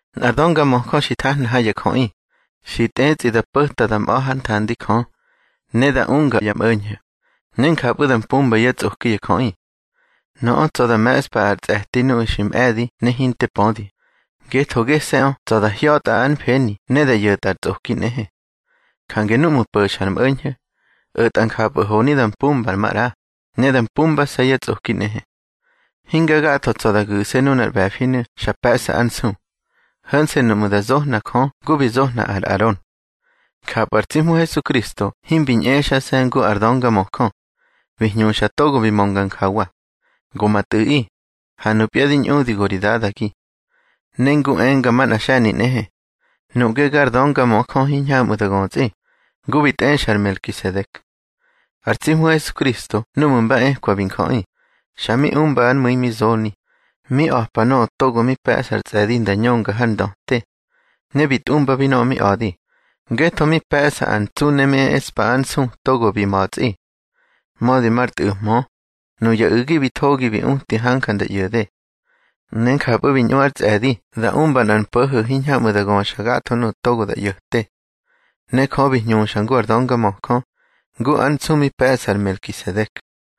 Nꞌar döngamöjö xi thahna ha ya jöꞌi, xi tꞌetsꞌi da po̱ta da mꞌa̱ hár nthandi Jö, ne da unga ya mꞌo̱ñho̱, ne njapꞌu̱ da mpumba yá tsꞌoki ya jöꞌi. Nöꞌö tsa̱ da me̱ꞌspa ar tsꞌe̱ti nuꞌu̱ xi mꞌe̱di ne hinte pödi, ngetho gese̱ꞌö tsa̱ da hya̱tꞌa ár mfeni ne da ꞌyo̱tꞌa ar tsꞌoki nꞌehe. Jange núꞌmu̱ po̱xa ar mꞌo̱ñho̱, o̱tꞌa njapꞌu̱ honi da mpumba maꞌra, ne da mpumbase̱ yá tsꞌoki nꞌehe. Hinga gatho tsa̱ da gu̱se̱ nunar ꞌbe̱finu̱ xa pe̱ꞌsa ar nsu, ho̱nse̱ nuꞌmu̱ da zohna Jö ngu bi zohna ar Aron. Njapꞌu̱ ar tsi Hmu Hesukristo himbi ñꞌexase̱ ngu ar döngamöjö. Bi hñuxa togo bi mönga njawa: Go ma Tꞌu̱ꞌi, ha nupya di ñꞌudi go ri Dadagi. Ne ngu enga manꞌa xe̱ni nꞌehe: Nuꞌge gar döngamöjö hiñhamꞌu̱ da götsꞌi, ngu bi tꞌexa ar Melkisedek. Ar tsi Hmu Hesukristo núꞌmu̱ ba ekwa bi njöꞌi, xa mi umba ár mu̱i mi zoni, mi a̱pa nöꞌö togo mi pe̱ꞌsa ar tsꞌe̱di nda ñönga har ndöte. Ne bi tꞌumbabi nöꞌö mi a̱di, ngetho mi pe̱ꞌsa ar ntsu ne mi eꞌspa ár nsu togo bi ma̱tsꞌi. Mödi mar tꞌu̱mhö, nuya u̱gi bi thogi bi uti hanja nda ꞌyo̱de. Ne njapꞌu̱ bi ñꞌu ár tsꞌe̱di da umba nꞌar mpo̱ho̱ hiñhamꞌu̱ da göxa gatho nuꞌu̱ togo da ꞌyo̱te. Ne Jö bi hñuxa ngu ar döngamöjö, ngu ar nsu mi pe̱ꞌsa ar Melkisedek.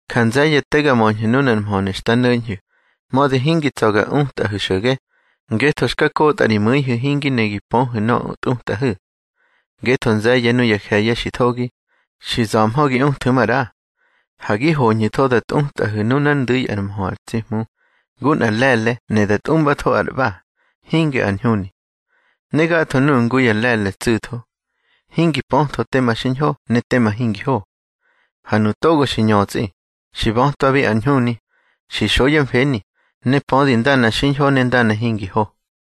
Ja nze̱ye̱ te ga möñhu̱ nunar mhönu̱ xta no̱ñhu̱, mödi hingi tsa̱ ga utꞌahu̱ xo̱ge, ngetho xka kotꞌa ri mu̱ihu̱ hingi ne gi pöhu̱ nöꞌö tꞌutꞌahu̱. Ngetho nze̱ye̱ nuya je̱ye̱ xi thogi, xi za̱mhö gi uthu̱ maꞌra. Ha gi hoñhu̱tho da tꞌutꞌahu̱ nunár ndu̱i ár mhö ar tsi Hmu, ngu nꞌar le̱le̱ ne da tꞌumbatho ar ꞌba, hinge ar ñhuni. Ne gatho nuꞌu̱ ngu ya le̱le̱ tsu̱tho, hingi pötho tema xiñho ne tema hingi ho. Ha nuꞌu̱ togo xi ñötsꞌi, xi bötwabi ar ñhuni, xi xo yá mfeni, ne pödi ndana xiñho ne ndana hingi ho.